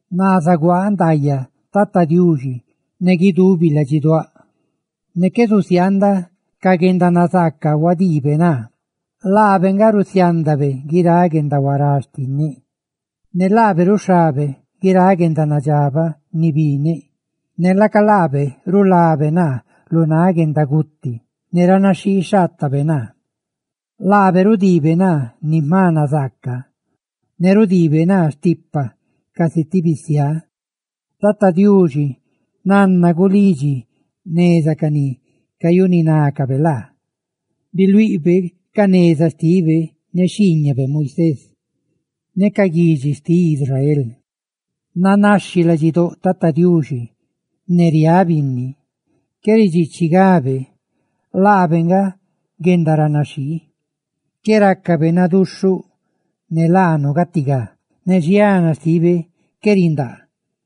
Naa zuguaaꞌ ndaayaꞌ Tata Diuxi ne guidubi ladxiduáꞌ; ne qué zusiaandaꞌ ca guendanazaaca huadiibe naa. Laabe nga rusiándabe guiráꞌ guendahuará xtinneꞌ, ne laabe ruxhabe guiráꞌ guendanadxabaꞌ ni bineꞌ, ne laca laabe rulabe naa lu náꞌ guendaguti, ne ranaxhixhaatabe naa, laabe rudiibe naa ni jma nazaaca, ne rudiibe naa stipa casi ti bisiá. Tata Diuxi nanna gulidxi jneza ca ni cayuninácabe laa. Biluiꞌbe ca neza xtibe ne xhiiñabe Moisés ne ca guidxi xtiꞌ Israel. Nanaxhi ladxidóꞌ Tata Diuxi ne riáꞌ binni; qué ridxiichigabe ne laabe nga guendaranaxhii. Qué rácabe naduxhuꞌ ne laanu gatigá, ne xiana xtibe qué rindaa;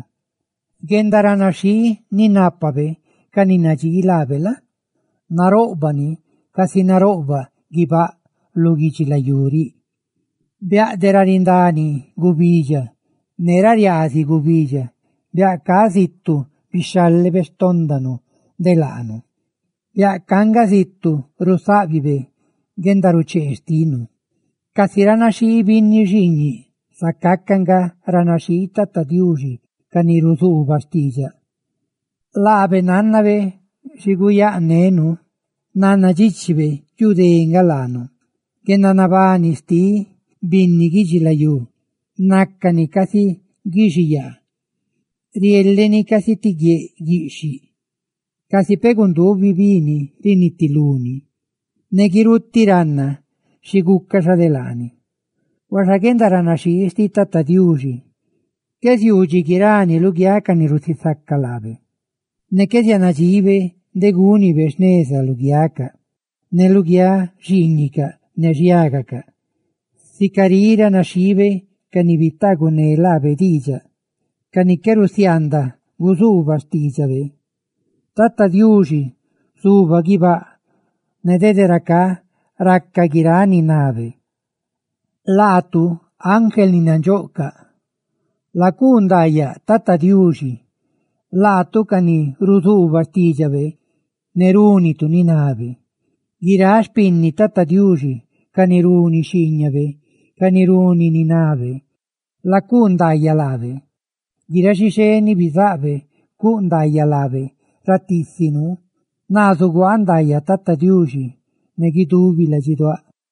naroꞌbaꞌ guendaranaxhii ni nápabe ca ni nadxii laabe casi naroꞌbaꞌ guibáꞌ lu guidxilayú riꞌ. Biaꞌ de ra rindani gubidxa ne ra riaaziꞌ gubidxa, biaꞌ ca zitu bixhálebe xtóndanu de laanu; biaꞌ ca nga zitu rusáꞌbibe guendaruchee xtinu. Casi ranaxhii binni xiiñiꞌ, zacá nga ranaxhii Tata Diuxi, ne ca ni ruzuubaꞌ xtiidxaꞌ; laabe nánnabe xiné guyanu; nannadxíchibe yu dé nga laanu. Guendanabani xtiꞌ binni guidxilayú nácani casi guixiyaa; rieleꞌ ni casi ti guieꞌ guiꞌxhiꞌ; casi peꞌ gundubi bi ni rinitulú ni, ne guirutiꞌ ruꞌ ranna xi gucaꞌ xa de laani. Huaxa guendaranaxhii xtiꞌ Tata Diuxi qué ziuu dxi guirani luguiáꞌ ca ni rusisaca laabe; ne qué zianadxibe de gúnibe jneza luguiacaꞌ ne luguiáꞌ xiiñicaꞌ, ne xhiágacaꞌ, sica riꞌ ranaxhiibe ca ni bitaaguné laabe diidxaꞌ ne ca ni qué rusiaandaꞌ guzuubaꞌ xtiidxabe. Tata Diuxi zuba guibáꞌ, ne dede racá raca guiráꞌ ni nabe. ¡Laatu ángel ni nandxoꞌcaꞌ, lacuu ndaayaꞌ Tata Diuxi! Laatu, ca ni ruzuubatu xtiidxabe, ne rúnitu ni nabe. ¡Guiráꞌ xpinni Tata Diuxi ca ni runi xhiiñabe ca ni runi ni nabe, lacuu ndaayaꞌ laabe! ¡Guiráꞌ xixé ni bizáꞌ Tata Diuxi, cuꞌ ndaayaꞌ laabe ratiisi nuu! ¡Naa zuguaaꞌ ndaayaꞌ Tata Diuxi ne guidubi ladxiduáꞌ!